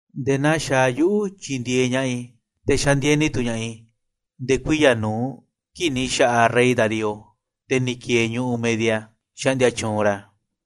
‘Nde̱e̱ naa xaaꞌ yuꞌu̱ tyindieeꞌ ña̱ꞌaꞌ i̱, te̱ xandieni tu̱ ña̱ꞌaꞌ i̱, nde̱e̱ kuiya̱ nu̱uꞌ kii̱ꞌ ni̱ xa̱ꞌaꞌ rey Darío, te̱ ni̱ ki̱e̱e̱ ñu̱ꞌuꞌ Media, xaꞌndia tyuunꞌ ra̱.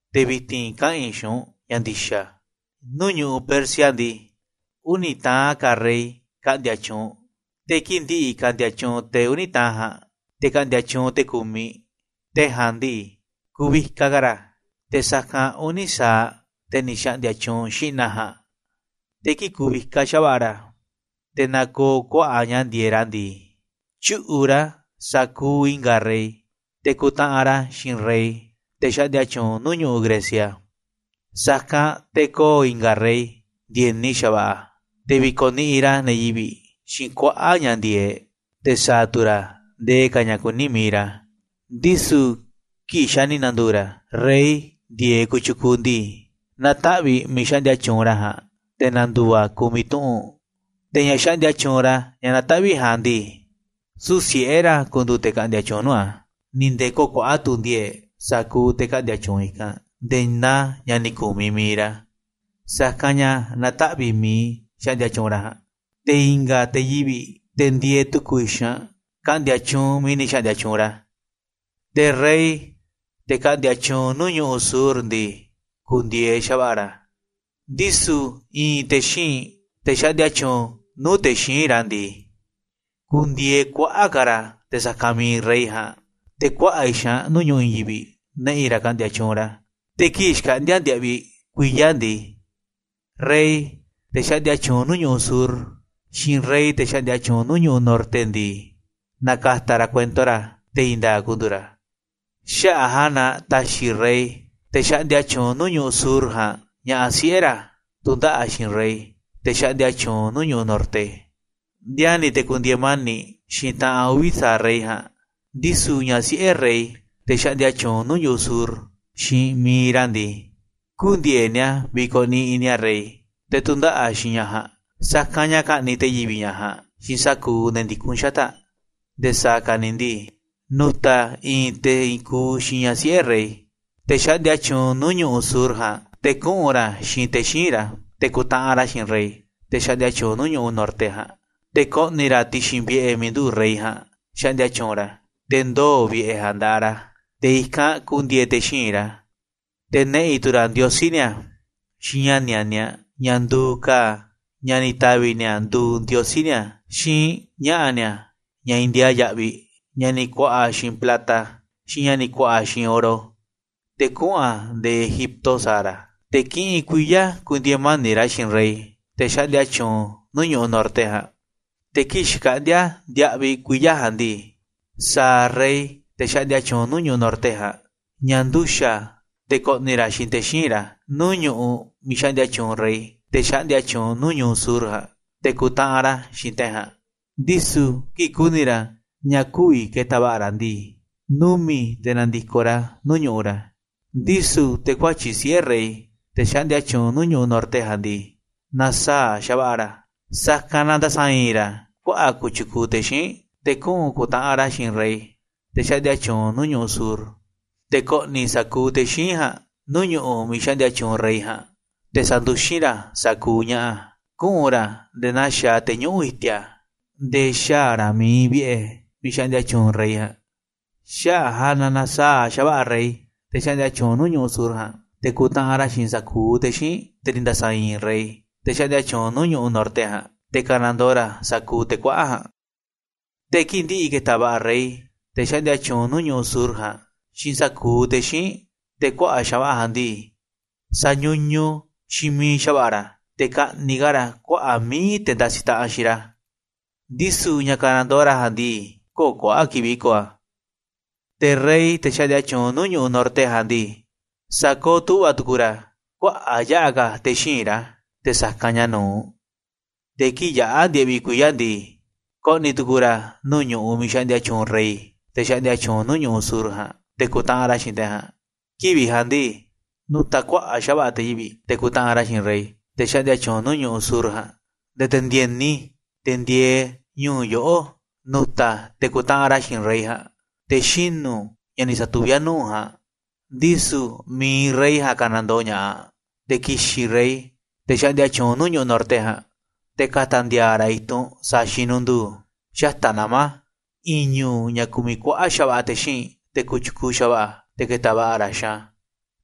‘Te̱ vi̱ti̱n kaꞌa̱n i̱ xiinꞌ u̱nꞌ ña̱ ndi̱xa̱. Nuu̱ꞌ ñu̱ꞌuꞌ Persia ndii, uni̱ taꞌan ka̱ rey ka̱ꞌndi̱a̱ tyuunꞌ, te̱ kii̱ꞌ ndi̱ꞌi̱ ka̱ꞌndi̱a̱ tyuunꞌ te̱ uni̱ taꞌan ja̱a̱nꞌ, te̱ ka̱ꞌndi̱a̱ tyuunꞌ te̱ ku̱miꞌ. Te̱ ja̱a̱nꞌ ndii, ku̱vikaꞌ ka̱ ra̱ te̱ sa̱kanꞌ uni̱ sa̱aꞌ te̱ ni̱ xa̱ꞌndi̱a̱ tyuunꞌ xi̱ꞌna̱ ja̱a̱nꞌ. Te̱ kii̱ꞌ ku̱vikaꞌ xa̱va̱ꞌa̱ ra̱, te̱ na̱koo̱ kuaꞌa̱ꞌ ña̱ ndi̱e̱eꞌ ra̱ ndii, tyu̱ꞌu̱ꞌ ra̱ sa̱kuuꞌ i̱nga̱ rey, te̱ ku̱ntaꞌanꞌ ra̱ xiinꞌ rey, te̱ xaꞌndia tyuunꞌ nuu̱ꞌ ñu̱ꞌuꞌ Grecia. Sa̱kanꞌ te̱ ko̱o̱ i̱nga̱ rey ndi̱e̱ni xa̱va̱ꞌa̱, te̱ vi̱ko̱ niꞌiꞌ ra̱ ne̱ yivi̱ꞌ xiinꞌ kuaꞌa̱ꞌ ña̱ ndi̱e̱eꞌ, te̱ sa̱a̱ tu̱ ra̱ ndee ka̱ ña̱ kuní mi̱iꞌ ra̱. Ndisu̱ kii̱ꞌ xa̱ ni̱ na̱ndu̱u̱ ra̱ rey ndi̱e̱eꞌ kotyukuuꞌ ndii, na̱taꞌvi̱ꞌ miiꞌ xaꞌndia tyuunꞌ ra̱ ja̱a̱nꞌ, te̱ na̱ndu̱u̱ a̱ ku̱miꞌ tuꞌu̱nꞌ. Te̱ ña̱ xaꞌndia tyuunꞌ ra̱ ña̱ na̱taꞌvi̱ꞌ ja̱a̱nꞌ ndii, süu̱ꞌ siꞌe̱ ra̱ ku̱ndu̱u̱ te̱ ka̱ꞌndi̱a̱ tyuunꞌ nuu̱ꞌ a̱, ni̱ nde̱e̱ kö̱o̱ kuaꞌa̱ꞌ tu̱ ndi̱e̱e̱ꞌ sa̱kuuꞌ te̱ ka̱ꞌndi̱a̱ tyuunꞌ i̱kanꞌ nde̱e̱ naa ña̱ ni̱ ku̱miꞌ mi̱iꞌ ra̱. Sa̱kanꞌ ña̱ na̱taꞌvi̱ꞌ miiꞌ xaꞌndia tyuunꞌ ra̱ ja̱a̱nꞌ, te̱ i̱nga̱ te̱ yivi̱ꞌ, te̱ ndieeꞌ tu̱ku̱ xaanꞌ, ka̱ꞌndi̱a̱ tyuunꞌ miiꞌ ni̱ xa̱ꞌndi̱a̱ tyuunꞌ ra̱. ‘Te̱ rey, te̱ ka̱ꞌndi̱a̱ tyuunꞌ nuu̱ꞌ ñu̱ꞌuꞌ sur ndii, ku̱ndi̱e̱eꞌ xa̱va̱ꞌa̱ ra̱, ndisu̱ i̱i̱n te̱ xíinꞌ, te̱ xaꞌndia tyuunꞌ nuu̱ꞌ te̱ xíinꞌ ra̱ ndii, ku̱ndi̱e̱eꞌ kuaꞌa̱ꞌ ka̱ ra̱ te̱ sa̱kanꞌ mi̱iꞌ rey ja̱a̱nꞌ. Te̱ kuaꞌa̱ꞌ xaanꞌ nuu̱ꞌ ñu̱ꞌuꞌ i̱i̱n yivi̱ꞌ na̱ꞌi̱ ra̱ ka̱ꞌndi̱a̱ tyuunꞌ ra̱. Te̱ kii̱ꞌ xkaꞌndi̱a̱ ndiaꞌviꞌ kuiya̱ ndii, rey, te̱ xaꞌndia tyuunꞌ nuu̱ꞌ ñu̱ꞌuꞌ sur, xiinꞌ rey te̱ xaꞌndia tyuunꞌ nuu̱ꞌ ñu̱ꞌuꞌ norte ndii, na̱ka̱ta̱ ra̱ kuento ra̱, te̱ i̱i̱n nda̱a̱ꞌ ku̱ndu̱u̱ ra̱. Xaꞌa̱ꞌ a̱ ja̱a̱nꞌ na ta̱xi̱ rey, te̱ xaꞌndia tyuunꞌ nuu̱ꞌ ñu̱ꞌuꞌ sur ja̱a̱nꞌ, ñaꞌaꞌ siꞌe̱ ra̱ tu̱ndaꞌa̱ꞌ xiinꞌ rey, te̱ xaꞌndia tyuunꞌ nuu̱ꞌ ñu̱ꞌuꞌ norte, ndiani̱ te̱ ku̱ndi̱e̱e̱ mani̱ꞌ xiinꞌ taꞌan uvi̱ sa̱aꞌ rey ja̱a̱nꞌ. Ndisu̱ ñaꞌ siꞌe̱ rey, te̱ xaꞌndia tyuunꞌ nuu̱ꞌ ñu̱ꞌuꞌ sur, xiinꞌ mi̱iꞌ ra̱ ndii, kü̱ndi̱e̱eꞌ ni̱a̱ vi̱ko̱ niꞌiꞌ ni̱a̱ rey, te̱ tu̱ndaꞌa̱ꞌ xiinꞌ ñaꞌ ja̱a̱nꞌ. Sa̱kanꞌ ña̱ ka̱ꞌni̱ꞌ te̱ yivi̱ꞌ ñaꞌ ja̱a̱nꞌ xiinꞌ sa̱kuuꞌ ne̱ ndikún xata̱ꞌ aꞌ. Nde̱e̱ sa̱a̱ ka̱ ni̱ ndii, nu̱ta̱ i̱i̱n te̱ i̱i̱n kuuꞌ xiinꞌ ñaꞌ siꞌe̱ rey, te̱ xaꞌndia tyuunꞌ nuu̱ꞌ ñu̱ꞌuꞌ sur ja̱a̱nꞌ, te̱ kuꞌu̱n ra̱ xiinꞌ te̱ xíinꞌ ra̱ te̱ ku̱ntaꞌanꞌ ra̱ xiinꞌ rey, te̱ xaꞌndia tyuunꞌ nuu̱ꞌ ñu̱ꞌuꞌ norte ja̱a̱nꞌ. Te̱ ko̱ꞌni̱ ra̱ ti̱xi̱n vi̱ꞌe̱ miiꞌ nduꞌu̱ꞌ rey ja̱a̱nꞌ xaꞌndia tyuunꞌ ra̱, te̱ ndoo̱ vi̱ꞌe̱ ja̱a̱nꞌ nda̱ꞌaꞌ ra̱, te̱ i̱kanꞌ ku̱ndi̱e̱e̱ te̱ xíinꞌ ra̱. Te̱ na̱ꞌi̱ tu̱ ra̱ ndiosí ni̱a̱ xiinꞌ ña̱ nianiaꞌ, ña̱ nduuꞌ ka̱a̱ ña̱ ni̱ ta̱vi̱ ni̱a̱ nduuꞌ ndiosí ni̱a̱, xiinꞌ ña̱ꞌa̱ ni̱a̱ ña̱ ndiaa yaꞌviꞌ, ña̱ ni̱ ku̱a̱ꞌa̱ xiinꞌ plata, xiinꞌ ña̱ ni̱ ku̱a̱ꞌa̱ xiinꞌ oro, te̱ kuꞌu̱n a̱ nde̱e̱ Egipto sa̱a̱ ra̱. Te̱ kiꞌinꞌ kuiya̱ ku̱ndi̱e̱e̱ mani̱ꞌ ra̱ xiinꞌ rey, te̱ xaꞌndia nuu̱ꞌ ñu̱ꞌuꞌ norte ja̱a̱nꞌ. Te̱ kii̱ꞌ xkaꞌndi̱a̱ ndiaꞌviꞌ kuiya̱ ja̱a̱nꞌ ndii, sa̱a̱ rey, te̱ xaꞌndia tyuunꞌ nuu̱ꞌ ñu̱ꞌuꞌ norte ja̱a̱nꞌ, ña̱ nduxa̱ꞌ te̱ ko̱ꞌni̱ ra̱ xiinꞌ te̱ xíinꞌ ra̱ nuu̱ꞌ ñu̱ꞌuꞌ miiꞌ xaꞌndia tyuunꞌ rey, te̱ xaꞌndia tyuunꞌ nuu̱ꞌ ñu̱ꞌuꞌ sur ja̱a̱nꞌ, te̱ ku̱ntaꞌanꞌ ra̱ xiinꞌ te̱ ja̱a̱nꞌ. Ndisu̱ kii̱ꞌ ku̱ni̱ ra̱ ña̱ kü̱vi̱ ke̱ta̱ va̱ꞌa̱ ra̱ ndii, numi̱ꞌ te̱ na̱ndi̱koꞌ ra̱ nuu̱ꞌ ñu̱ꞌuꞌ ra̱. ‘Ndisu̱ te̱ kuatyi̱ꞌ siꞌe̱ rey, te̱ xaꞌndia tyuunꞌ nuu̱ꞌ ñu̱ꞌuꞌ norte ja̱a̱nꞌ ndii, na̱saa̱ꞌ xa̱va̱ꞌa̱ ra̱, sa̱kanꞌ na nda̱sa̱i̱i̱n ra̱ kuaꞌa̱ꞌ kotyukuuꞌ te̱ xíinꞌ, te̱ kuꞌu̱n ku̱ntaꞌanꞌ ra̱ xiinꞌ rey, te̱ xaꞌndia tyuunꞌ nuu̱ꞌ ñu̱ꞌuꞌ sur. Te̱ ko̱ꞌni̱ sa̱kuuꞌ te̱ xíinꞌ ja̱a̱nꞌ nuu̱ꞌ ñu̱ꞌuꞌ miiꞌ xaꞌndia tyuunꞌ rey ja̱a̱nꞌ, te̱ sa̱nduxín ra̱ sa̱kuuꞌ ña̱ꞌa̱, kuꞌu̱n ra̱ nde̱e̱ naa xaaꞌ te̱ ñuꞌu̱ꞌ i̱ti̱a̱, nde̱e̱ xaa̱ ra̱ miiꞌ iinꞌ vi̱ꞌe̱ miiꞌ xaꞌndia tyuunꞌ rey ja̱a̱nꞌ. Xaꞌa̱ꞌ a̱ ja̱a̱nꞌ na na̱saa̱ꞌ xa̱va̱ꞌa̱ rey, te̱ xaꞌndia tyuunꞌ nuu̱ꞌ ñu̱ꞌuꞌ sur ja̱a̱nꞌ, te̱ ku̱ntaꞌanꞌ ra̱ xiinꞌ sa̱kuuꞌ te̱ xíinꞌ, te̱ ni̱ nda̱sa̱i̱i̱n rey, te̱ xaꞌndia tyuunꞌ nuu̱ꞌ ñu̱ꞌuꞌ norte ja̱a̱nꞌ, te̱ ka̱nandoo ra̱ sa̱kuuꞌ te̱ kuaꞌa̱ꞌ ja̱a̱nꞌ. Te̱ kii̱ꞌ ndi̱ꞌi̱ ke̱ta̱ va̱ꞌa̱ rey, te̱ xaꞌndia tyuunꞌ nuu̱ꞌ ñu̱ꞌuꞌ sur ja̱a̱nꞌ, xiinꞌ sa̱kuuꞌ te̱ xíinꞌ, te̱ kuaꞌa̱ꞌ xa̱va̱ꞌa̱ ja̱a̱nꞌ ndii, sa̱ñuñuꞌ xiinꞌ miiꞌ xa̱va̱ꞌa̱ ra̱, te̱ ka̱ꞌni̱ꞌ ka̱ ra̱ kuaꞌa̱ꞌ mi̱iꞌ te̱ ndasiꞌ taꞌanꞌ xiinꞌ ra̱, ndisu̱ ña̱ ka̱nandoo ra̱ ja̱a̱nꞌ ndii, kö̱o̱ kuaꞌa̱ꞌ kivi̱ꞌ ko̱o̱ a̱. Te̱ rey, te̱ xaꞌndia tyuunꞌ nuu̱ꞌ ñu̱ꞌuꞌ norte ja̱a̱nꞌ ndii, sa̱kooꞌ tu̱ꞌva̱ tu̱ku̱u̱ ra̱ kuaꞌa̱ꞌ yaꞌa̱ ka̱ te̱ xíinꞌ ra̱ te̱ sa̱kanꞌ ña̱ nu̱uꞌ, te̱ kii̱ꞌ yaꞌa̱ ndiaꞌviꞌ kuiya̱ ndii, ko̱ꞌni̱ tu̱ku̱u̱ ra̱ nuu̱ꞌ ñu̱ꞌuꞌ miiꞌ xaꞌndia tyuunꞌ rey, te̱ xaꞌndia tyuunꞌ nuu̱ꞌ ñu̱ꞌuꞌ sur ja̱a̱nꞌ, te̱ ku̱ntaꞌanꞌ ra̱ xiinꞌ te̱ ja̱a̱nꞌ. ‘Kivi̱ꞌ ja̱a̱nꞌ ndii, nu̱ta̱ kuaꞌa̱ꞌ xa̱va̱ꞌa̱ te̱ yivi̱ꞌ, te̱ ku̱ntaꞌanꞌ ra̱ xiinꞌ rey, te̱ xaꞌndia tyuunꞌ nuu̱ꞌ ñu̱ꞌuꞌ sur ja̱a̱nꞌ, nde̱e̱ te̱ ndi̱e̱ni, te̱ ndieeꞌ ñu̱u̱ yoꞌó, nu̱ta̱ te̱ ku̱ntaꞌanꞌ ra̱ xiinꞌ rey ja̱a̱nꞌ, te̱ xinu̱ ña̱ ni̱ sa̱tuví a̱ nuu̱ꞌ u̱nꞌ ja̱a̱nꞌ, ndisu̱ mi̱iꞌ rey ja̱a̱nꞌ ka̱nandoo ña̱ꞌaꞌ. Te̱ ki̱xi̱n rey, te̱ xaꞌndia tyuunꞌ nuu̱ꞌ ñu̱ꞌuꞌ norte ja̱a̱nꞌ, te̱ ka̱ta̱ ndi̱a̱a̱ ra̱ i̱tunꞌ sa̱a̱ xinunduu xata̱ꞌ nama̱ i̱i̱n ñu̱u̱ ña̱ kumiꞌ kuaꞌa̱ꞌ xa̱va̱ꞌa̱ te̱ xíinꞌ, te̱ kotyukuuꞌ xa̱va̱ꞌa̱, te̱ ke̱ta̱ va̱ꞌa̱ ra̱ xiinꞌ a̱.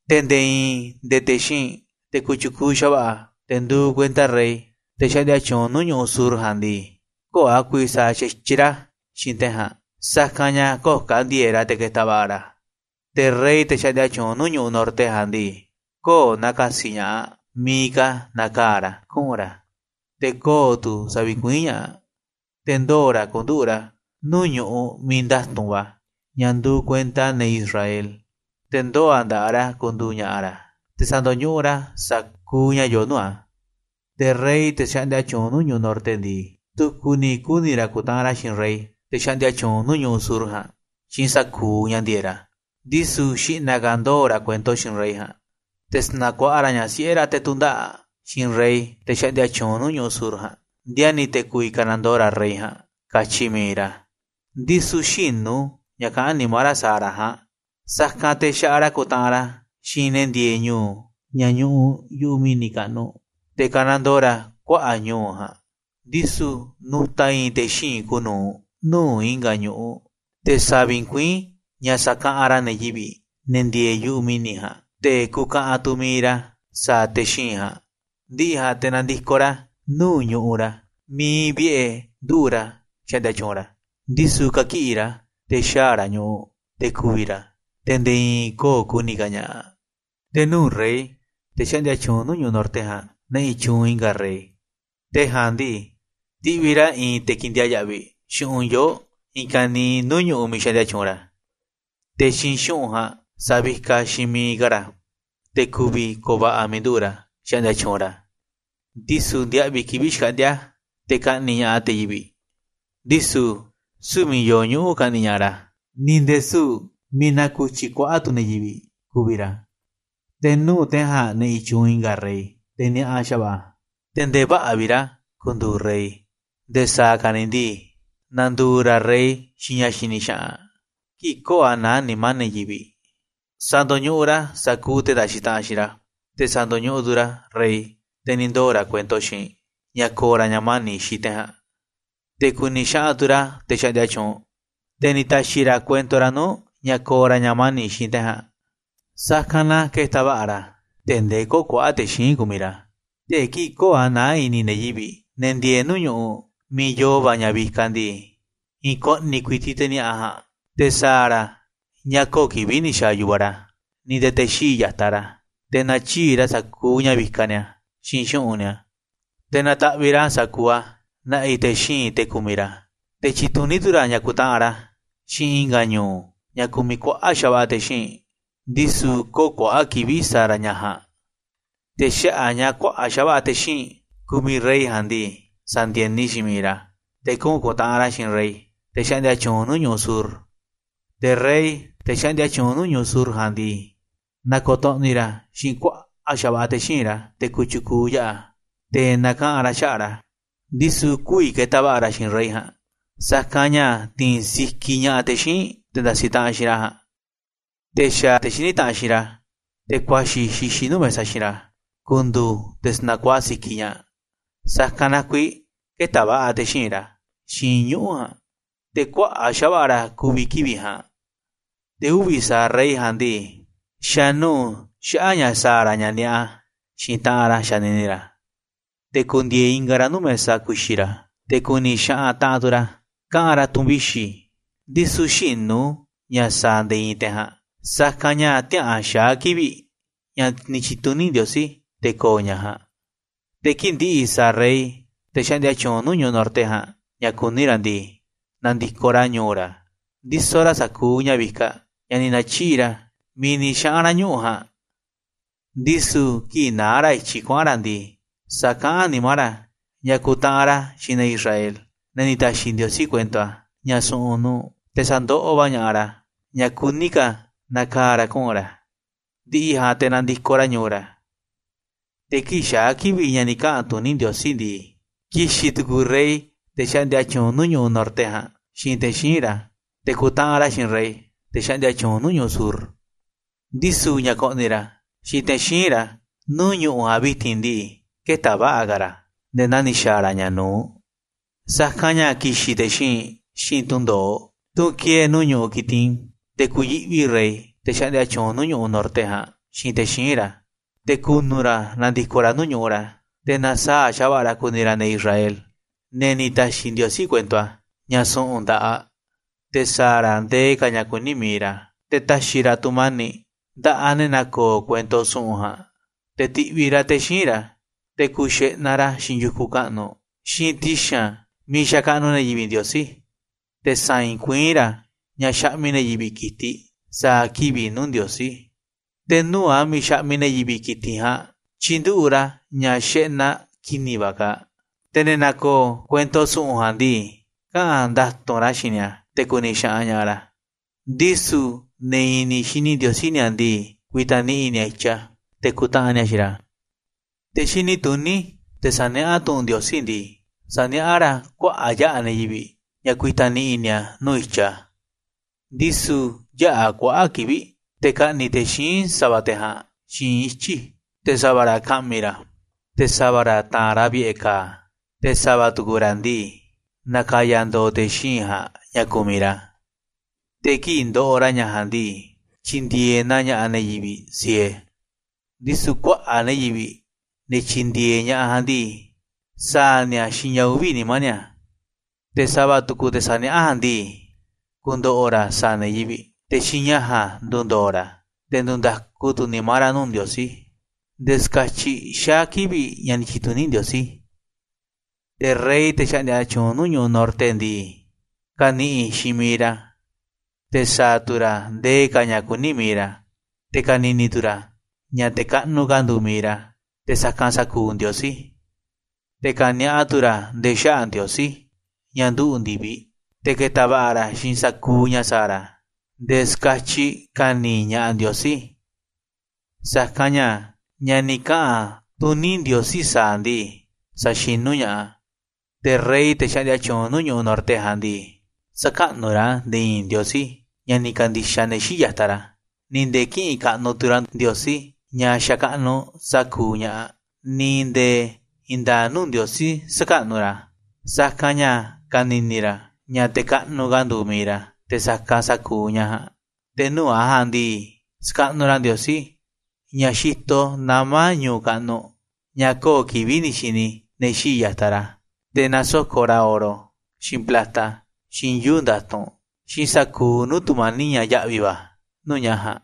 Te̱ nde̱e̱ i̱i̱n nde̱e̱ te̱ xíinꞌ, te̱ kotyukuuꞌ xa̱va̱ꞌa̱, te̱ nduuꞌ kuenta rey, te̱ xaꞌndia tyuunꞌ nuu̱ꞌ ñu̱ꞌuꞌ sur ja̱a̱nꞌ ndii, kö̱o̱ a̱ ku̱vi̱ sa̱a̱ xa̱tyiꞌ ra̱ xiinꞌ te̱ ja̱a̱nꞌ, sa̱kanꞌ ña̱ kö̱o̱ ka̱ ndi̱e̱e̱ꞌ ra̱ te̱ ke̱ta̱ va̱ꞌa̱ ra̱. Te̱ rey, te̱ xaꞌndia tyuunꞌ nuu̱ꞌ ñu̱ꞌuꞌ norte ja̱a̱nꞌ ndii, kö̱o̱ na̱ka̱si̱ ña̱ꞌaꞌ miiꞌ ka̱ na̱kaa̱ ra̱ kuꞌu̱n ra̱, te̱ kö̱o̱ tu̱ sa̱vi̱kuiín ña̱ꞌaꞌ. Te̱ ndoo̱ ra̱ ku̱nduꞌu̱ꞌ ra̱ nuu̱ꞌ ñuꞌuꞌ miiꞌ nda̱tu̱nꞌ va̱, ña̱ nduuꞌ kuenta ne̱ Israel, te̱ ndoo̱ a̱ nda̱ꞌaꞌ ra̱ ku̱ndu̱u̱ ña̱ꞌa̱ ra̱, te̱ sa̱ndo̱ñuꞌuꞌ ra̱ sa̱kuuꞌ ña̱ yoo nuu̱ꞌ a̱. Te̱ rey, te̱ xaꞌndia tyuunꞌ nuu̱ꞌ ñu̱ꞌuꞌ norte ndii, tu̱ku̱ ni̱ kuni̱ ra̱ ku̱ntaꞌanꞌ ra̱ xiinꞌ rey, te̱ xaꞌndia tyuunꞌ nuu̱ꞌ ñu̱ꞌuꞌ sur ja̱a̱nꞌ, xiinꞌ sa̱kuuꞌ ña̱ ndi̱e̱eꞌ ra̱ Ndisu̱ xi̱ꞌna̱ ka̱ ndoo̱ ra̱ kuento xiinꞌ rey ja̱a̱nꞌ, te̱ sa̱na̱ kuaꞌa ra̱ ñaꞌ siꞌe̱ ra̱ te̱ tu̱ndaꞌa̱ꞌ aꞌ xiinꞌ rey, te̱ xaꞌndia tyuunꞌ nuu̱ꞌ ñu̱ꞌuꞌ sur ja̱a̱nꞌ, ndiani̱ te̱ ku̱vi̱ ka̱nandoo ra̱ rey ja̱a̱nꞌ, katyi mi̱iꞌ ra̱, ndisu̱ xïnu̱ ña̱ kaꞌán nimá ra̱ sa̱a̱ ra̱ ja̱a̱nꞌ. Sa̱kanꞌ te̱ xa̱ꞌaꞌ ra̱ ku̱ntaꞌanꞌ ra̱ xiinꞌ ne̱ ndieeꞌ ñu̱u̱ ña̱ ñuꞌuꞌ yu̱ꞌuꞌ mi̱ni̱ kaꞌnuꞌ, te̱ ka̱nandoo ra̱ kuaꞌa̱ꞌ ñu̱u̱ ja̱a̱nꞌ, ndisu̱ nu̱ta̱ i̱i̱n te̱ xíinꞌ kuuꞌ nu̱uꞌ nuu̱ꞌ i̱nga̱ ñu̱ꞌuꞌ, te̱ sa̱vi̱kuiín ña̱ sakaꞌanꞌ ra̱ ne̱ yivi̱ꞌ, ne̱ ndieeꞌ yu̱ꞌuꞌ mi̱ni̱ ja̱a̱nꞌ, te̱ ku̱ka̱ꞌa̱n tu̱ mi̱iꞌ ra̱ sa̱a̱ te̱ xíinꞌ ja̱a̱nꞌ. Ndi̱ꞌi̱ ja̱a̱nꞌ, te̱ na̱ndi̱koꞌ ra̱ nuu̱ꞌ ñu̱ꞌuꞌ ra̱ miiꞌ iinꞌ vi̱ꞌe̱ nduꞌu̱ꞌ ra̱ xaꞌndia tyuunꞌ ra̱, ndisu̱ kakiꞌi̱ ra̱, te̱ xaa̱ ra̱ ñu̱ꞌuꞌ, te̱ ku̱vi̱ ra̱, te̱ nde̱e̱ i̱i̱n kö̱o̱ ku̱ni̱ ka̱ ña̱ꞌaꞌ. ‘Te̱ nuu̱ꞌ rey, te̱ xaꞌndia tyuunꞌ nuu̱ꞌ ñu̱ꞌuꞌ norte ja̱a̱nꞌ, na̱ꞌi̱ tyuunꞌ i̱nga̱ rey. Te̱ ja̱a̱nꞌ ndii, ti̱ꞌviꞌ ra̱ i̱i̱n te̱ ke̱ndiaa̱ꞌ yaꞌviꞌ xu̱ꞌunꞌ yoo̱ꞌ i̱i̱n ka̱niiꞌ nuu̱ꞌ ñu̱ꞌuꞌ miiꞌ xaꞌndia tyuunꞌ ra̱, te̱ xiinꞌ xu̱ꞌunꞌ ja̱a̱nꞌ sa̱vikaꞌ xiinꞌ mi̱iꞌ ka̱ ra̱, te̱ ku̱vi̱ ko̱o̱ va̱ꞌa̱ miiꞌ nduꞌu̱ꞌ ra̱ xaꞌndia tyuunꞌ ra̱, ndisu̱ ndiaꞌviꞌ kivi̱ꞌ xkaꞌndi̱a̱ te̱ ka̱ꞌni̱ꞌ ña̱ꞌaꞌ te̱ yivi̱ꞌ. Ndisu̱ süu̱ꞌ miiꞌ yoo ñuꞌu̱ ka̱ꞌni̱ꞌ ña̱ꞌaꞌ ra̱, ni̱ nde̱e̱ süu̱ꞌ miiꞌ naku̱tyi kuaꞌa̱ꞌ tu̱ ne̱ yivi̱ꞌ ku̱vi̱ ra̱. ‘Te̱ nuu̱ꞌ te̱ ja̱a̱nꞌ na̱ꞌi̱ tyuunꞌ i̱nga̱ rey, te̱ ni̱a̱ꞌa xa̱va̱ꞌa̱, te̱ nde̱e̱ vä̱ꞌa̱ vi̱ꞌ ra̱ ku̱ndu̱u̱ rey. Nde̱e̱ sa̱a̱ ka̱ ni̱ ndii, na̱ndu̱u̱ ra̱ rey xiinꞌ ña̱ xini xaꞌanꞌ, kii̱ꞌ kö̱o̱ a̱ naá nimá ne̱ yivi̱ꞌ. Sa̱ndo̱ñuꞌuꞌ ra̱ sa̱kuuꞌ te̱ ndasiꞌ taꞌanꞌ xiinꞌ ra̱, te̱ sa̱ndo̱ñuꞌuꞌ tu̱ ra̱ rey, te̱ ni̱ ndoo̱ ra̱ kuento xiinꞌ ña̱ ko̱o̱ ra̱ ña̱ mani̱ꞌ xiinꞌ te̱ ja̱a̱nꞌ. Te̱ ku̱ni̱ xaꞌanꞌ tu̱ ra̱ te̱ xaꞌndia tyuunꞌ, te̱ ni̱ ta̱xi̱ ra̱ kuento ra̱ nuu̱ꞌ ña̱ ko̱o̱ ra̱ ña̱ mani̱ꞌ xiinꞌ te̱ ja̱a̱nꞌ, sa̱kanꞌ na ke̱ta̱ va̱ꞌa̱ ra̱ tee̱ꞌ ndee kö̱o̱ kuaꞌa̱ꞌ te̱ xíinꞌ kumiꞌ ra̱. Te̱ kii̱ꞌ kö̱o̱ a̱ naá i̱ni̱ ne̱ yivi̱ꞌ, ne̱ ndieeꞌ nuu̱ꞌ ñu̱ꞌuꞌ miiꞌ yoo va̱ ña̱ vikaꞌ ndii, i̱i̱n ko̱ꞌni̱ ku̱i̱ti̱ꞌ te̱ ni̱a̱ꞌa ja̱a̱nꞌ, te̱ sa̱a̱ ra̱ ña̱ kö̱o̱ kivi̱ꞌ ni̱ xa̱a̱ yu̱vaꞌ ra̱, ni̱ nde̱e̱ te̱ xii̱ꞌ ya̱taꞌ ra̱. Te̱ na̱tyiꞌi̱ꞌ ra̱ sa̱kuuꞌ ña̱ vikaꞌ ni̱a̱, xiinꞌ xu̱ꞌunꞌ ni̱a̱, te̱ na̱ta̱ꞌviꞌ ra̱ sa̱kuuꞌ a̱ na̱ꞌi̱ te̱ xíinꞌ, te̱ kumiꞌ ra̱. Te̱ tyi̱tuní tu̱ ra̱ ña̱ ku̱ntaꞌanꞌ ra̱ xiinꞌ i̱nga̱ ñu̱u̱, ña̱ kumiꞌ kuaꞌa̱ꞌ xa̱va̱ꞌa̱ te̱ xíinꞌ, ndisu̱ kö̱o̱ kuaꞌa̱ꞌ kivi̱ꞌ sa̱a̱ ra̱ ña̱ ja̱a̱nꞌ. ‘Te̱ xaꞌa̱ꞌ a̱ ña̱ kuaꞌa̱ꞌ xa̱va̱ꞌa̱ te̱ xíinꞌ kumiꞌ rey ja̱a̱nꞌ ndii, sa̱ndi̱e̱ni xiinꞌ miiꞌ ra̱, te̱ kuꞌu̱n ku̱ntaꞌanꞌ ra̱ xiinꞌ rey, te̱ xaꞌndia tyuunꞌ nuu̱ꞌ ñu̱ꞌuꞌ sur. Te̱ rey, te̱ xaꞌndia tyuunꞌ nuu̱ꞌ ñu̱ꞌuꞌ sur ja̱a̱nꞌ ndii, na̱ko̱to̱ꞌni̱ ra̱ xiinꞌ kuaꞌa̱ꞌ xa̱va̱ꞌa̱ te̱ xíinꞌ ra̱, te̱ kotyukuuꞌ yaꞌa̱, te̱ na̱kaꞌa̱n ra̱ xaꞌa̱ꞌ ra̱, ndisu̱ kü̱vi̱ ke̱ta̱ va̱ꞌa̱ ra̱ xiinꞌ rey ja̱a̱nꞌ, sa̱kanꞌ ña̱ ti̱i̱n sikiꞌ ña̱ꞌaꞌ te̱ xíinꞌ te̱ ndasiꞌ taꞌanꞌ xiinꞌ ra̱ ja̱a̱nꞌ. Te̱ xa̱ te̱ xiní taꞌanꞌ xiinꞌ ra̱, te̱ kuaxi̱ xixiꞌ nuu̱ꞌ mesa xiinꞌ ra̱, ku̱ndu̱u̱ te̱ sa̱na̱kuaꞌa sikiꞌ ña̱ꞌaꞌ, sa̱kanꞌ na kuiiꞌ kë̱ta̱ va̱ꞌa̱ te̱ xíinꞌ ra̱ xiinꞌ ñuꞌu̱ ja̱a̱nꞌ, te̱ kuaꞌa̱ꞌ xa̱va̱ꞌa̱ ra̱ ku̱vi̱ kivi̱ꞌ ja̱a̱nꞌ. Te̱ uvi̱ sa̱aꞌ rey ja̱a̱nꞌ ndii, xa̱ nuu̱ꞌ xaꞌa̱ꞌ ña̱ sa̱a̱ ra̱ ña̱ ni̱a̱ꞌa xiinꞌ taꞌanꞌ ra̱ xanini ra̱, te̱ ku̱ndi̱e̱e̱ ingaꞌ ra̱ nuu̱ꞌ mesa ku̱xi̱ ra̱, te̱ ku̱ni̱ xaꞌanꞌ taꞌanꞌ tu̱ ra̱ kaꞌa̱n ra̱ tu̱n vixi̱, ndisu̱ xïnu̱ ña̱ sa̱a̱ nde̱e̱ i̱i̱n te̱ ja̱a̱nꞌ, sa̱kanꞌ ña̱ tiäꞌa̱an xaa̱ kivi̱ꞌ ña̱ ni̱ tyi̱tuní Ndiosí te̱ ko̱o̱ ña̱ ja̱a̱nꞌ. Te̱ kii̱ꞌ ndi̱ꞌi̱ sa̱a̱ rey, te̱ xaꞌndia nuu̱ꞌ ñu̱ꞌuꞌ norte ja̱a̱nꞌ, ña̱ kuní ra̱ ndii, na̱ndi̱koꞌ ra̱ ñu̱u̱ ra̱ ndisoꞌ ra̱ sa̱kuuꞌ ña̱ vikaꞌ ña̱ ni̱ na̱tyiꞌi̱ꞌ ra̱ miiꞌ ni̱ xaꞌa̱n ra̱ ñuꞌu̱ ja̱a̱nꞌ, ndisu̱ kii̱ꞌ naá ra̱ i̱tyiꞌ kuaꞌa̱n ra̱ ndii, sa̱kaꞌán a̱ nimá ra̱ ña̱ ku̱ntaꞌanꞌ ra̱ xiinꞌ ne̱ Israel, ne̱ ni̱ ta̱xi̱ Ndiosí kuento a̱, ña̱ su̱ꞌu̱n nuu̱ꞌ, te̱ sa̱ndoꞌoꞌ va̱ ña̱ꞌaꞌ ra̱ ña̱ kuní ka̱ na̱kaa̱ ra̱ kuꞌu̱n ra̱, ndi̱ꞌi̱ ja̱a̱nꞌ te̱ na̱ndi̱koꞌ ra̱ ñu̱u̱ ra̱. ‘Te̱ kii̱ꞌ xaa̱ kivi̱ꞌ ña̱ ni̱ kaꞌa̱n tuní Ndiosí ndii, ki̱xi̱n tu̱ku̱u̱ rey, te̱ xaꞌndia tyuunꞌ nuu̱ꞌ ñu̱ꞌuꞌ norte ja̱a̱nꞌ, xiinꞌ te̱ xíinꞌ ra̱, te̱ ku̱ntaꞌanꞌ ra̱ xiinꞌ rey, te̱ xaꞌndia tyuunꞌ nuu̱ꞌ ñu̱ꞌuꞌ sur. Ndisu̱ ña̱ ko̱ꞌni̱ ra̱ xiinꞌ te̱ xíinꞌ ra̱ nuu̱ꞌ ñu̱ꞌuꞌ ja̱a̱nꞌ vi̱ti̱n ndii, kë̱ta̱ va̱ꞌa̱ ka̱ ra̱ nde̱e̱ naa ni̱ xa̱a̱ ra̱ ña̱ nu̱uꞌ. Sa̱kanꞌ ña̱ ki̱xi̱n te̱ xíinꞌ xiinꞌ tundo̱oꞌ, tunꞌ ki̱e̱e̱ nuu̱ꞌ ñu̱ꞌuꞌ Quitim, te̱ ku̱yi̱ꞌvi rey, te̱ xaꞌndia tyuunꞌ nuu̱ꞌ ñu̱ꞌuꞌ norte ja̱a̱nꞌ, xiinꞌ te̱ xíinꞌ ra̱, te̱ ku̱nu̱ ra̱ na̱ndi̱koꞌ ra̱ nuu̱ꞌ ñu̱ꞌuꞌ ra̱. Te̱ na̱saa̱ꞌ xa̱va̱ꞌa̱ ra̱ ku̱ni̱ ra̱ ne̱ Israel, ne̱ ni̱ ta̱xi̱ Ndiosí kuento a̱, ña̱ su̱ꞌu̱n nda̱ꞌaꞌ, te̱ sa̱a̱ ra̱ ndee ka̱ ña̱ kuní mi̱iꞌ ra̱. Te̱ ta̱xi̱ ra̱ tu̱mani̱ꞌ nda̱ꞌaꞌ ne̱ na̱ko̱o̱ kuento su̱ꞌu̱n ja̱a̱nꞌ. ‘Te̱ ti̱ꞌviꞌ ra̱ te̱ xíinꞌ ra̱, te̱ ku̱u̱ xeꞌnaꞌ ra̱ xiinꞌ yu̱kunꞌ kaꞌnuꞌ, xiinꞌ ti̱xi̱n a̱ miiꞌ xakaꞌnuꞌ ne̱ yivi̱ꞌ Ndiosí, te̱ sa̱i̱i̱n kuiín ra̱ ña̱ xaꞌmiꞌ ne̱ yivi̱ꞌ ki̱tiꞌ sa̱a̱ kivi̱ꞌ nuu̱ꞌ Ndiosí. Te̱ nuu̱ꞌ a̱ miiꞌ xaꞌmiꞌ ne̱ yivi̱ꞌ ki̱tiꞌ ja̱a̱nꞌ tyi̱nduꞌu̱ꞌ ra̱ ña̱ xeꞌnaꞌ ki̱ni̱ va̱ kaaꞌ. Te̱ ne̱ na̱ko̱o̱ kuento su̱ꞌu̱n ja̱a̱nꞌ ndii, kaꞌa̱n nda̱tu̱nꞌ ra̱ xiinꞌ ni̱a̱, te̱ ku̱ni̱ xaꞌanꞌ ña̱ꞌaꞌ ra̱, ndisu̱ ne̱ i̱ni̱ xini Ndiosí ni̱a̱ ndii, ku̱i̱ta̱ ni̱ꞌi̱ ni̱a̱ i̱tyiꞌ a̱, te̱ ku̱ntaꞌanꞌ ni̱a̱ xiinꞌ ra̱. ‘Te̱ xini tuní, te̱ sa̱niaꞌá tu̱ꞌu̱n Ndiosí ndii, sa̱niaꞌá ra̱ kuaꞌa̱ꞌ yaꞌa̱ ne̱ yivi̱ꞌ ña̱ ku̱i̱ta̱ ni̱ꞌi̱ ni̱a̱ nuu̱ꞌ i̱tyiꞌ a̱. Ndisu̱ yäꞌa̱ kuaꞌa̱ꞌ kivi̱ꞌ te̱ ka̱ꞌni̱ꞌ te̱ xíinꞌ sa̱va̱ te̱ ja̱a̱nꞌ xiinꞌ ityi̱, te̱ sa̱va̱ ra̱ ka̱ꞌmi̱ ra̱, te̱ sa̱va̱ ra̱ ta̱a̱nꞌ ra̱ vi̱ꞌe̱ ka̱a̱, te̱ sa̱va̱ tu̱ku̱ ra̱ ndii, na̱ka̱ya̱ ndo̱o̱ te̱ xíinꞌ ja̱a̱nꞌ ña̱ kumiꞌ ra̱. Te̱ kii̱ꞌ ndoꞌoꞌ ra̱ ña̱ ja̱a̱nꞌ ndii, tyi̱ndi̱e̱eꞌ na ña̱ꞌaꞌ ne̱ yivi̱ꞌ sie, ndisu̱ kuaꞌa̱ꞌ ne̱ yivi̱ꞌ, ne̱ tyi̱ndi̱e̱eꞌ ña̱ꞌaꞌ ja̱a̱nꞌ ndii, sa̱a̱ ni̱a̱ xiinꞌ ña̱ uvi̱ nimá ni̱a̱. Te̱ sa̱va̱ tu̱ku̱ te̱ saniaꞌá ja̱a̱nꞌ ndii, ku̱ndo̱ꞌo̱ ra̱ sa̱a̱ ne̱ yivi̱ꞌ, te̱ xiinꞌ ña̱ ja̱a̱nꞌ ndu̱ndo̱o̱ ra̱, te̱ ndu̱nda̱ku tu̱ nimá ra̱ nuu̱ꞌ Ndiosí, nde̱e̱ ska̱tyiꞌ xaa̱ kivi̱ꞌ ña̱ ni̱ tyi̱tuní Ndiosí. ‘Te̱ rey, te̱ xaꞌndia tyuunꞌ nuu̱ꞌ ñu̱ꞌuꞌ norte ndii, ka̱ni̱ꞌi̱ xiinꞌ miiꞌ ra̱, te̱ sa̱a̱ tu̱ ra̱ ndee ka̱ ña̱ kuní mi̱iꞌ ra̱, te̱ ka̱ni̱ni̱ tu̱ ra̱ ña̱ te̱ kaꞌnuꞌ ka̱ nduuꞌ mi̱iꞌ ra̱ te̱ sa̱kanꞌ sa̱kuuꞌ ndiosí, te̱ ka̱ni̱a̱ꞌa tu̱ ra̱ nde̱e̱ xaꞌa̱ꞌ Ndiosí, ña̱ nduꞌu̱ꞌ ndi̱viꞌ. Te̱ ke̱ta̱ va̱ꞌa̱ ra̱ xiinꞌ sa̱kuuꞌ ña̱ sa̱a̱ ra̱ nde̱e̱ ska̱tyiꞌ ka̱ni̱ ña̱ꞌaꞌ Ndiosí, sa̱kanꞌ ña̱, ña̱ ni̱ kaꞌa̱n tuní Ndiosí sa̱a̱ a̱ ndii, sa̱xinú ña̱ꞌaꞌ a̱. Te̱ rey, te̱ xaꞌndia tyuunꞌ nuu̱ꞌ ñu̱ꞌuꞌ norte ja̱a̱nꞌ ndii, sä̱kaꞌnuꞌ ra̱ nde̱e̱ i̱i̱n ndiosí, ña̱ ni̱ ka̱ndi̱xaꞌ ne̱ xii̱ꞌ ya̱taꞌ ra̱, ni̱ nde̱e̱ kï̱ꞌi̱n kaꞌnuꞌ tu̱ ra̱ ndiosí, ña̱ xakaꞌnuꞌ sa̱kuuꞌ ña̱ꞌaꞌ, ni̱ nde̱e̱ i̱i̱n nda̱a̱ꞌ nuu̱ꞌ ndiosí sä̱kaꞌnuꞌ ra̱, sa̱kanꞌ ña̱ ka̱ni̱ni̱ ra̱ ña̱ te̱ kaꞌnuꞌ ka̱ nduuꞌ mi̱iꞌ ra̱ te̱ sa̱kanꞌ sa̱kuuꞌ ña̱ ja̱a̱nꞌ. Te̱ nuu̱ꞌ a̱ ja̱a̱nꞌ ndii, sa̱kaꞌnuꞌ ra̱ ndiosí, ña̱ xitoꞌ nama̱ ñu̱u̱ kaꞌnuꞌ, ña̱ kö̱o̱ kivi̱ꞌ ni̱ xini ne̱ xii̱ꞌ ya̱taꞌ ra̱. Te̱ na̱soko̱ꞌ ra̱ oro, xiinꞌ plata, xiinꞌ yuu̱ꞌ nda̱tu̱nꞌ, xiinꞌ sa̱kuuꞌ nuu̱ꞌ tu̱mani̱ꞌ ña̱ ya̱ꞌvi̱ va̱, nuu̱ꞌ ña̱ ja̱a̱nꞌ.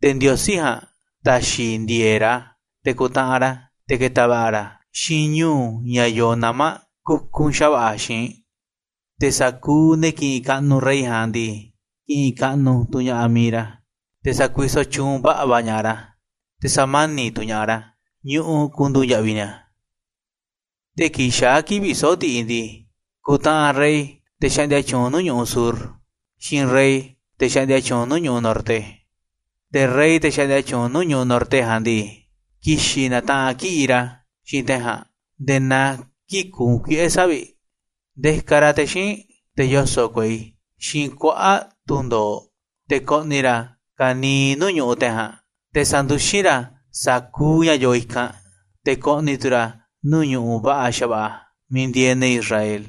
Te̱ ndiosí ja̱a̱nꞌ ta̱xi̱ ndi̱e̱e̱ꞌ ra̱, te̱ ku̱ntaꞌanꞌ ra̱, te̱ ke̱ta̱ va̱ꞌa̱ ra̱ xiinꞌ ñu̱u̱ ña̱ yoo nama̱ kukunꞌ xa̱va̱ꞌa̱ xi̱i̱nꞌ, te̱ sa̱kuuꞌ ne̱ ki̱ꞌi̱n kaꞌnuꞌ rey ja̱a̱nꞌ ndii, ki̱ꞌi̱n kaꞌnuꞌ tu̱ ña̱ꞌaꞌ mi̱iꞌ ra̱, te̱ sa̱kuisoꞌ tyuunꞌ va̱ꞌa̱ va̱ ña̱ꞌaꞌ ra̱, te̱ sa̱mani̱ꞌ tu̱ ña̱ꞌaꞌ ra̱ ñu̱ꞌuꞌ ku̱ndu̱u̱ ya̱ꞌvi̱ ni̱a̱. ‘Te̱ kii̱ꞌ xaa̱ kivi̱ꞌ soꞌo̱ꞌ ndiꞌiꞌ ndii, ku̱ntaꞌanꞌ rey, te̱ xaꞌndia tyuunꞌ nuu̱ꞌ ñu̱ꞌuꞌ sur, xiinꞌ rey, te̱ xaꞌndia tyuunꞌ nuu̱ꞌ ñu̱ꞌuꞌ norte. Te̱ rey, te̱ xaꞌndia tyuunꞌ nuu̱ꞌ ñu̱ꞌuꞌ norte ja̱a̱nꞌ ndii, ki̱xi̱n na̱taꞌanꞌ kiꞌi̱ꞌ ra̱ xiinꞌ te̱ ja̱a̱nꞌ nde̱e̱ naa kii̱ꞌ kuunꞌ kuiꞌe̱ savi̱ꞌ, ndiakaꞌ ra̱ te̱ xíinꞌ, te̱ yoso̱ꞌ kuei, xiinꞌ kuaꞌa̱ꞌ tunꞌ ndo̱oꞌ, te̱ ko̱ꞌni̱ ra̱ ka̱niiꞌ nuu̱ꞌ ñu̱ꞌuꞌ te̱ ja̱a̱nꞌ, te̱ sa̱nduxín ra̱ sa̱kuuꞌ ña̱ yoo i̱kanꞌ. Te̱ ko̱ꞌni̱ tu̱ ra̱ nuu̱ꞌ ñu̱ꞌuꞌ va̱ꞌa̱ xa̱va̱ꞌa̱ miiꞌ ndieeꞌ ne̱ Israel,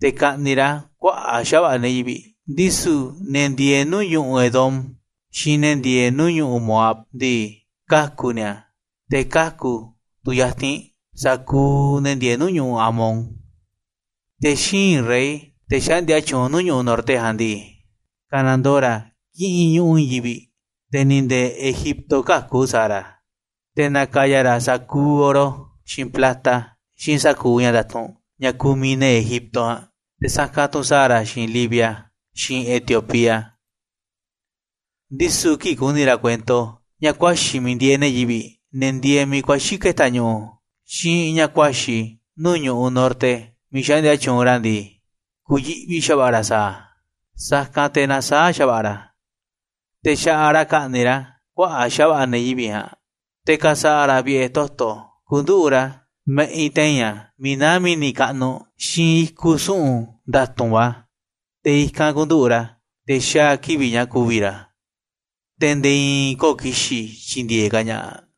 te̱ ka̱ꞌni̱ꞌ ra̱ kuaꞌa̱ꞌ xa̱va̱ꞌa̱ ne̱ yivi̱ꞌ, ndisu̱ ne̱ ndieeꞌ nuu̱ꞌ ñu̱ꞌuꞌ Edom, xiinꞌ ne̱ ndieeꞌ nuu̱ꞌ ñu̱ꞌuꞌ Moab ndii, kaku̱ ni̱a̱, te̱ kaku̱ tu̱ yatinꞌ sa̱kuuꞌ ne̱ ndieeꞌ nuu̱ꞌ ñu̱ꞌuꞌ Amón. Te̱ xíinꞌ rey, te̱ xaꞌndia tyuunꞌ nuu̱ꞌ ñu̱ꞌuꞌ norte ja̱a̱nꞌ ndii, ka̱nandoo ra̱ kiꞌinꞌ ñu̱ꞌuꞌ i̱i̱n yivi̱ꞌ, te̱ ni̱ nde̱e̱ Egipto käku̱ sa̱a̱ ra̱. Te̱ na̱ka̱ya̱ ra̱ sa̱kuuꞌ oro, xiinꞌ plata, xiinꞌ sa̱kuuꞌ ña̱ nda̱tu̱nꞌ ña̱ kumiꞌ ne̱ Egipto ja̱a̱nꞌ, te̱ sa̱kanꞌ tu̱ sa̱a̱ ra̱ xiinꞌ Libia, xiinꞌ Etiopía. ‘Ndisu̱ kii̱ꞌ ku̱ni̱ ra̱ kuento ña̱ kuaxi̱ miiꞌ ndieeꞌ ne̱ yivi̱ꞌ, ne̱ ndieeꞌ miiꞌ kuaxi̱ ke̱ta̱ ñu̱ꞌu̱, xiinꞌ ña̱ kuaxi̱ nuu̱ꞌ ñu̱ꞌuꞌ norte miiꞌ xaꞌndia tyuunꞌ ra̱ ndii, ku̱yi̱ꞌvi xa̱va̱ꞌa̱ ra̱ sa̱a̱ a̱, sa̱kanꞌ te̱ na̱saa̱ꞌ xa̱va̱ꞌa̱ ra̱, te̱ xa̱ꞌaꞌ ra̱ ka̱ꞌni̱ꞌ ra̱ kuaꞌa̱ꞌ xa̱va̱ꞌa̱ ne̱ yivi̱ꞌ ja̱a̱nꞌ. Te̱ ka̱sa̱ꞌa̱ ra̱ vi̱ꞌe̱ toto̱ ku̱nduꞌu̱ꞌ ra̱ ma̱ꞌinꞌ te̱i̱n a̱ miiꞌ naá mi̱ni̱ kaꞌnuꞌ xiinꞌ i̱kuꞌ su̱ꞌu̱n nda̱tu̱nꞌ va̱, te̱ i̱kanꞌ ku̱nduꞌu̱ꞌ ra̱, te̱ xaa̱ kivi̱ꞌ ña̱ ku̱vi̱ ra̱, te̱ nde̱e̱ i̱i̱n kö̱o̱ ki̱xi̱n tyi̱ndi̱e̱eꞌ ka̱ ña̱ꞌaꞌ.